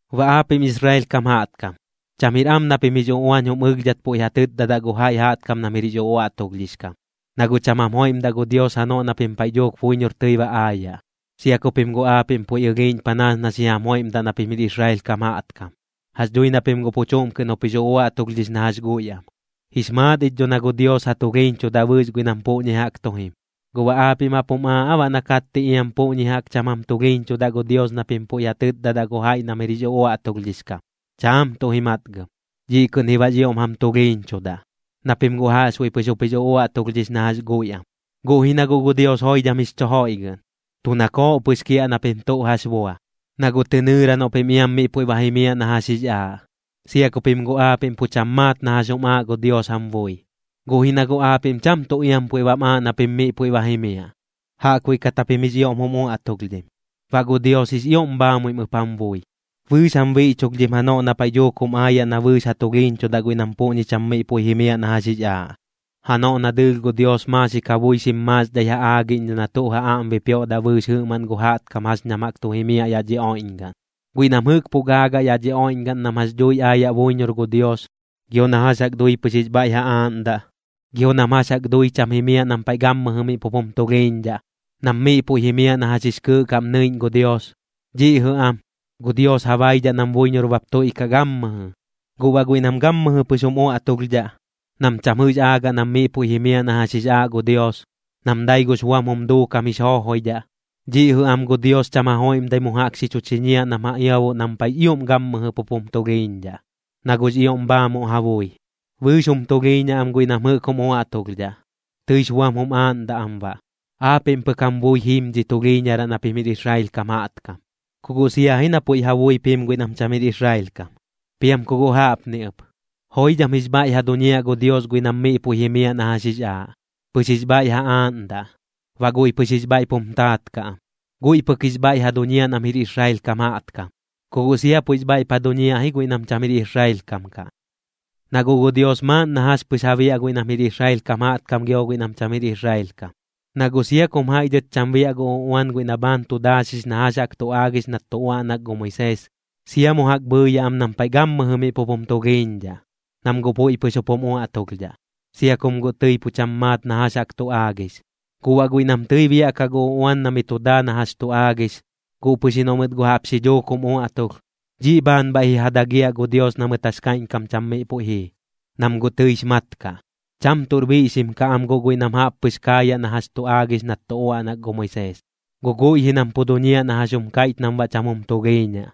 Baꞌ aapiꞌm Israel kam jaꞌtkam, cham jir am na pim jix uꞌuañ jum ɨlhdhat puiꞌ ja tɨtdadaꞌ gu jaiꞌ jaꞌtkam nam jir jix uꞌuaꞌtulhdhix kam, na guꞌ cham jam joiꞌmdaꞌ gu Dios janoꞌ na pim paiꞌ dhuuk buiñor tɨi ba aayaꞌ, sia ku pim guꞌ aapiꞌm puiꞌ ɨlhiiꞌñ panaas na xi jam joiꞌmdaꞌ na pim jir Israel kam jaꞌtkam. Jax dhui na pim guꞌ pu chuꞌm kɨꞌn jup jix uꞌuaꞌtulhdhix na jax guiꞌ am. Jix maat ich dho na gu Dios ja tulhiiñchudaꞌ bɨɨx guiꞌ nam puꞌñi jaꞌk tu jim. ¿Guꞌ baꞌ aapiꞌm jaꞌp jum aaꞌ aa baꞌ na katti iam puꞌñi jaꞌk cham jam tulhiiñchudaꞌ gu Dios na pim puiꞌ ja tɨtdadaꞌ gu jaiꞌ nam jir jix uꞌuaꞌtulhdhix kam? Chaam tuꞌ ji matgɨm. Dhiꞌ kɨꞌn ji baꞌx ioꞌm jam tulhiiñchudaꞌ, na pim guꞌ jaꞌxbuiꞌ pɨx jup jix uꞌuaꞌtulhdhix na jax guiꞌ am. Guꞌ ji na guꞌ gu Dios joidham jix chu joiꞌgɨꞌn, tu nakooꞌ pɨx kiaꞌ na pim tuꞌ jax bua, na guꞌ tɨ nɨɨra noꞌ pim iam miꞌ puiꞌ ba jimiaꞌ na jax jix aaꞌ, sia ku pim guꞌ aapiꞌm pu cham maat na jax jum aaꞌ gu Dios jam bui. Guꞌ ji na guꞌ aapiꞌm cham tuꞌ iam puiꞌ bam aaꞌ na pim miꞌ puiꞌ ba jimiaꞌ, jaꞌkbuiꞌ kat japim jix ioꞌm jum uaꞌtulhdhim. Baꞌ gu Dios jix ioꞌm bhaamuim ɨp jam bui, bɨɨx jam biꞌchulhdhim janoꞌ na paiꞌ dhuuk jum aayaꞌ na bɨɨx ja tulhiiñchudaꞌ guiꞌ nam puꞌñi cham miꞌ puiꞌ jimiaꞌ na jax jix aaꞌ, janoꞌ na dɨɨlh gu Dios maaxik ja bui xim maaxdhai ja aagiꞌñdhaꞌ na tuꞌ ja aꞌm bipioꞌdaꞌ bɨɨx jɨꞌmaꞌn gu jaꞌtkam jax ñam jaꞌk tu jimiaꞌ yaꞌ dhi oiꞌñgaꞌn. Guiꞌ nam jɨꞌk pu gaagaꞌ yaꞌ dhi oiꞌñgaꞌn nam jax dhui aayaꞌ buiñor gu Dios, gio na jax jaꞌk dui pɨx jix bhaiꞌ ja aaꞌndaꞌ, gio nam jax jaꞌk dui cham jimiaꞌ nam paiꞌ gammɨjɨ miꞌ pup jum tulhiiñdhaꞌ, nam miꞌ puiꞌ jimiaꞌ na jax jix kɨɨꞌ kaꞌm nɨiꞌñ gu Dios, dhiꞌ jɨꞌ am, gu Dios ja baidhaꞌ nam buiñor bap tuiꞌkaꞌ gammɨjɨ. Guꞌ baꞌ guiꞌ nam gammɨjɨ pɨx jum uaꞌtulhdhaꞌ, nam cham jɨꞌx aagaꞌ nam miꞌ puiꞌ jimiaꞌ na jax jix aaꞌ gu Dios, nam dai gux buam jum duukam jix joojoidhaꞌ, dhiꞌ jɨꞌ am gu Dios cham ja joiꞌmdai mu jaꞌk xi chu chiñiaꞌ nam ja iaboꞌ nam paiꞌx ioꞌm gammɨjɨ pup jum tulhiiñdhaꞌ, na guꞌx ioꞌm bhaamuꞌ ja bui. Bɨɨx jum tulhiiñaꞌ am guiꞌ nam jɨꞌk jum uaꞌtulhdhaꞌ, tɨix buam jum aaꞌndaꞌ am baꞌ. Aapiꞌm pɨk jam bui jim dhi tulhiiñaraꞌ na pim jir Israel kam jaꞌtkam, ku guꞌ sia ji na puiꞌ ja buip jim guiꞌ nam cham jir Israel kam. Piam ku guꞌ jaꞌpni ɨp, joidham jix bhaiꞌ ja duñiaꞌ gu Dios guiꞌ nam miꞌ puiꞌ jimiaꞌ na jax jix aaꞌ, pɨx jix bhaiꞌ ja aaꞌndaꞌ, baꞌ guiꞌ pɨx jix bhaiꞌp jum taat kaꞌ am. Guiꞌ pɨk jix bhaiꞌ ja duñiaꞌ nam jir Israel kam jaꞌtkam, ku guꞌ sia puiꞌx bhaiꞌp ja duñiaꞌ ji guiꞌ nam cham jir Israel kam kaꞌ. Na guꞌ gu Dios maaꞌn na jax pɨx ja biaꞌ guiꞌ nam jir Israel kam jaꞌtkam gio guiꞌ nam cham jir Israel kam. Na guꞌ sia kum jaiꞌ dhɨt cham biaꞌ gu uꞌuan guiꞌ na bhaan tu daaxix na jax jaꞌk tu aagix nat tu uaꞌnak gu Moisees, sia mu jaꞌk bhɨɨyaꞌ am nam paiꞌ gammɨjɨ miꞌ pup jum tulhiiñdhaꞌ, nam guꞌ puiꞌ pɨx jup jum uaꞌtulhdhaꞌ, sia kum guꞌ tɨi pu cham maat na jax jaꞌk tu aagix. Guꞌ baꞌ guiꞌ nam tɨi biaꞌkaꞌ gu uꞌuan na mi tu daa na jax tu aagix, guꞌ pɨx ji noꞌ mɨt guꞌ jaꞌp xi dhuuk jum uaꞌtulh, dhiꞌ bhaan bhaiꞌ ji ja dagiaꞌ gu Dios na mɨt jax kaiꞌñkam cham miꞌ puiꞌ jii, nam guꞌ tɨix mat kaꞌ. Cham tuꞌr biꞌxim kaꞌ am guꞌ guiꞌ nam jaꞌp pɨx kaayaꞌ na jax tu aagix nat tu uaꞌnak gu Moisees, guꞌ guiꞌ ji nam pu duñiaꞌ na jax jum kaiꞌch nam baꞌ cham jum tulhiiñaꞌ.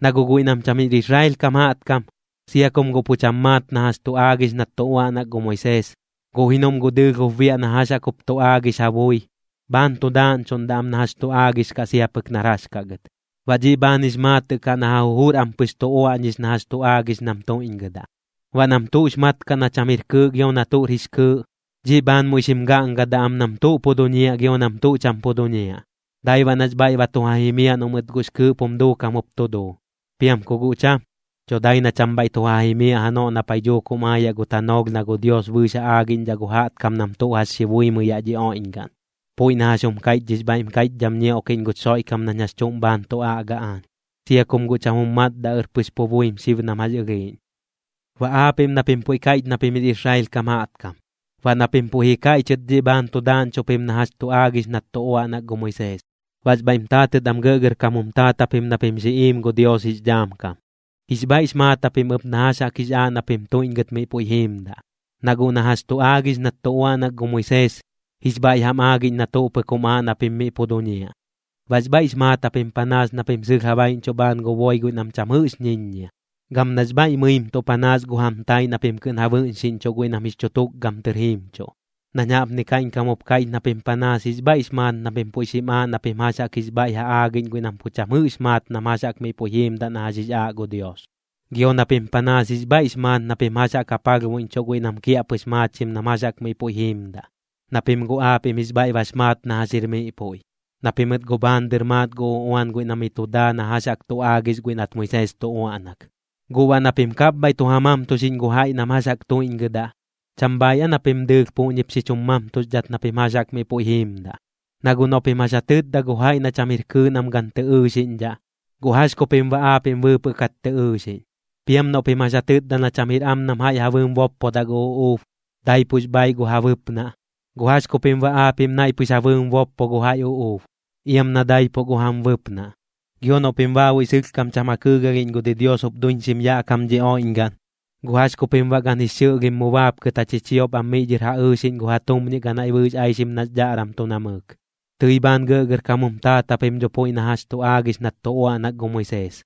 Na guꞌ guiꞌ nam cham jir Israel kam jaꞌtkam, sia kum guꞌ pu cham maat na jax tu aagix nat tu uaꞌnak gu Moisees, guꞌ ji noꞌm guꞌ dɨɨlh jup biaꞌ na jax jaꞌk jup tu aagix ja bui, bhaan tu daaꞌñchuꞌndaꞌ am na jax tu aagix kaꞌ sia pɨk nar jax kaꞌ gɨt. Baꞌ dhiꞌ bhaan jix maatɨꞌ kaꞌ na ja jujur am pɨx tu uaꞌñix na jax tu aagix nam tuiꞌñgɨdaꞌ. Baꞌ nam tuꞌx mat kaꞌ na cham jir kɨɨꞌ gio na tuꞌr jix kɨɨꞌ, dhiꞌ bhaan muiꞌ xim gaꞌngadaꞌ am nam tuꞌ pu duñiaꞌ gio nam tuꞌ cham pu duñiaꞌ, dai baꞌ nax bhaiꞌ ba tu ja jimiaꞌ noꞌ mɨt guꞌx kɨɨꞌp jum duukam jup tu duu. Piam ku guꞌ cham, dho dai na cham bhaiꞌ tu ja jimiaꞌ janoꞌ na paiꞌ dhuuk jum aayaꞌ gu tanoolh na gu Dios bɨɨx ja aagiꞌñdhaꞌ gu jaꞌtkam nam tuꞌ jax xi buimɨi yaꞌ dhi oiꞌñgaꞌn, puiꞌ na jax jum kaiꞌch dhix bhaiꞌm kaiꞌchdham ñioꞌkiꞌñ guch Xoiꞌkam nañ jax chuꞌm bhaan tu aꞌga aañ, sia kum guꞌ cham jum matdaꞌɨr pɨx pu buim xib nam jax ɨlhiiꞌñ. Baꞌ aapiꞌm na pim puiꞌ kaiꞌch na pim jir Israel kam jaꞌtkam, baꞌ na pim puiꞌ ji kaiꞌchɨt dhiꞌ bhaan tu daaꞌñchuꞌ pim na jax tu aagix nat tu uaꞌnak gu Moisees. Baꞌx bhaiꞌm taatɨt am gɇꞌgɇrkam jum taat japim na pim xi iim gu Dios jix dhaam kam. Jix bhaiꞌx maat japim ɨp na jax jaꞌk jix aaꞌ na pim tuiꞌñgɨt miꞌ puiꞌ jiimdaꞌ, na guꞌ na jax tu aagix nat tu uaꞌnak gu Moisees, jix bhaiꞌ jam aagiꞌñ na tuꞌ pɨk jum aaꞌ na pim miꞌ pu duñiaꞌ. Baꞌx bhaiꞌx maat japim panaas na pim sɨlh ja baiꞌñchuꞌ bhaan gu boi guiꞌ nam cham jɨꞌx ñiññia, gam nax bhaiꞌ mɨimtuꞌ panaas gu jam taaiꞌ na pim kɨꞌn ja bɨꞌñxiꞌñchuꞌ guiꞌ nam jix chu tukgam tɨr jiimchuꞌ. Nañ jaꞌpni kaiꞌñkam jup kaiꞌch na pim panaas jix bhaiꞌx maat na pim puiꞌ xim aaꞌ na pim jax jaꞌk jix bhaiꞌ ja aagiꞌñ guiꞌ nam pu cham jɨꞌx maat nam jax jaꞌk miꞌ puiꞌ jiimdaꞌ na jax jix aaꞌ gu Dios, gio na pim panaas jix bhaiꞌx maat na pim jax jaꞌk ja palhbuiꞌñchuꞌ guiꞌ nam kiaꞌpɨx maachim nam jax jaꞌk miꞌ puiꞌ jiimdaꞌ, na pim guꞌ aapiꞌm jix bhaiꞌ bax maat na jax jir miꞌ puiꞌ, na pimɨt guꞌ bhaan dɨr maat gu uꞌuan guiꞌ na miꞌ tu daa na jax jaꞌk tu aagix guiꞌ nat Moisees tu uaꞌnak. Guꞌ baꞌ na pim kapbhaiꞌ tu ja mamtuxiꞌñ gu jaiꞌ nam jax jaꞌk tuiꞌñgɨdaꞌ, ¿cham bhaaiꞌ aa na pim dɨɨlh puꞌñip xi chum mamtuxdhat na pim jax jaꞌk miꞌ puiꞌ jiimdaꞌ? Na guꞌ noꞌ pim jax ja tɨtda gu jaiꞌ na cham jir kɨɨꞌ nam gan tɨ ɨɨxiꞌñdhaꞌ, ¿guꞌ jax ku pim baꞌ aapiꞌm bɨɨpɨꞌ kat tɨ ɨɨxiꞌñ? Piam noꞌ pim jax ja tɨtda na cham jir am nam jaiꞌ ja bɨɨm boppodaꞌ gu uꞌuub, daipux bhaaiꞌ gu ja bɨpnaꞌ, ¿guꞌ jax ku pim baꞌ aapiꞌm naiꞌ pɨx ja bɨɨm boppo gu jaiꞌ uꞌuub, iam na daipuꞌ gu jam bɨpnaꞌ? Gio noꞌ pim baabuiꞌ sɨlhkam cham ja kɨɨgalhiꞌñ gu didios jup duiñxim yaꞌ kam dhi oiꞌñgaꞌn, ¿guꞌ jax ku pim baꞌ gan jix xɨꞌlhim mu baapkɨt ja chichiop am miꞌ dhɨr ja ɨɨxiꞌñ gu ja tumñiꞌ ganaiꞌ bɨɨx aixim nax dhaꞌram tu namɨɨk? Tɨi bhaan gɇꞌgɇrkam jum taat japim dho puiꞌ na jax tu aagix nat tu uaꞌnak gu Moisees,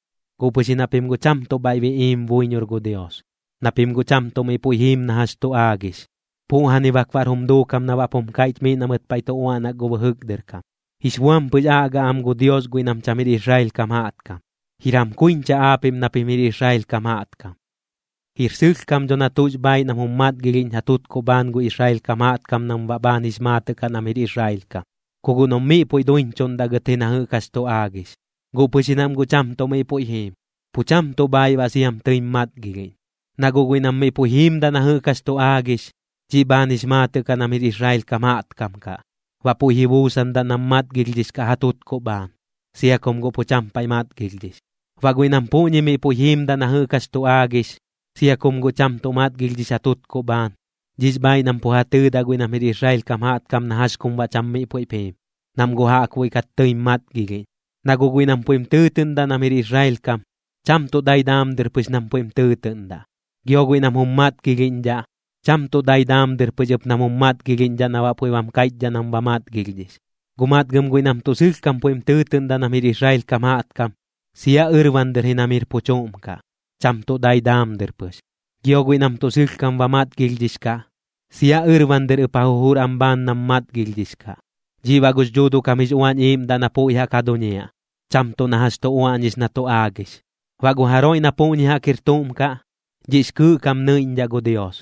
guꞌ pɨx ji na pim guꞌ cham tuꞌ bhaiꞌ biꞌiim buiñor gu Dios, na pim guꞌ cham tuꞌ miꞌ puiꞌ jiim na jax tu aagix. Puꞌjani bak baꞌr jum duukam na baꞌp jum kaiꞌch miꞌ na mɨt paiꞌ tu uaꞌnak gu bɨjɨk dɨr kam: “Jix buam pɨx aꞌga am gu Dios guiꞌ nam cham jir Israel kam jaꞌtkam. Jir jam kuiñcha aapiꞌm na pim jir Israel kam jaꞌtkam.” Jir sɨlhkam dho na tuꞌx bhaaiꞌ nam jum matgilhiꞌñ ja tutkuꞌ bhaan gu Israel kam jaꞌtkam nam baꞌ bhaan jix maatɨꞌ kaꞌ nam jir Israel kam, ku guꞌ noꞌm miꞌ puiꞌp duiñchuꞌndaꞌ gɨt ji na jɨꞌk jax tu aagix. Guꞌ pɨx ji nam guꞌ cham tuꞌ miꞌ puiꞌ jiim, pu cham tuꞌ bhaaiꞌ baꞌ siam tɨim matgilhiꞌñ. Na guꞌ guiꞌ nam miꞌ puiꞌ jiimdaꞌ na jɨꞌk jax tu aagix, dhiꞌ bhaan jix maatɨꞌ kaꞌ nam jir Israel kam jaꞌtkam kaꞌ, baꞌ puiꞌ ji buusandaꞌ nam matgilhdhix kaꞌ ja tutkuꞌ bhaan, sia kum guꞌ pu cham paiꞌ matgilhdhix. Baꞌ guiꞌ nam puꞌñi miꞌ puiꞌ jiimdaꞌ na jɨꞌk jax tu aagix, sia kum guꞌ cham tuꞌ matgilhdhix ja tutkuꞌ bhaan, dhiꞌx bhaaiꞌ nam pu ja tɨɨdaꞌ guiꞌ nam jir Israel kam jaꞌtkam na jax kum baꞌ cham miꞌ puiꞌp jiim, nam guꞌ jaꞌkbuiꞌ kat tɨim matgilhiꞌñ. Na guꞌ guiꞌ nam puiꞌm tɨɨtɨꞌndaꞌ nam jir Israel kam, cham tuꞌ dai daam dɨr pɨx nam puiꞌm tɨɨtɨꞌndaꞌ. Gio guiꞌ nam jum matgilhiꞌñdhaꞌ, cham tuꞌ dai daam dɨr pɨx ɨp nam jum matgilhiꞌñdhaꞌ na baꞌ puiꞌ bam kaiꞌchdhaꞌ nam ba matgilhdhix. Guꞌ matgɨm guiꞌ nam tuꞌ sɨlhkam puiꞌm tɨɨtɨꞌndaꞌ nam jir Israel kam jaꞌtkam, sia ɨrban dɨr ji nam jir pu chuꞌm kaꞌ, cham tuꞌ dai daam dɨr pɨx. Gio guiꞌ nam tuꞌ sɨlhkam ba matgilhdhix kaꞌ, sia ɨrban dɨr ɨp ja jujur am bhaan nam matgilhdhix kaꞌ. Dhiꞌ baꞌ gux Dhuuduꞌ kam jix Uañ Iiꞌmdaꞌ na puiꞌ jaꞌk ja duñiaꞌ, cham tuꞌ na jax tu uaꞌñix na tu aagix. Baꞌ gu jaroiꞌ na puꞌñi jaꞌk jir tuꞌm kaꞌ, dhiꞌx kɨɨꞌ kaꞌm nɨiꞌñdhaꞌ gu Dios,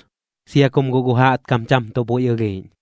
sia kum guꞌ gu jaꞌtkam cham tuꞌ puiꞌ ɨlhiiꞌñ.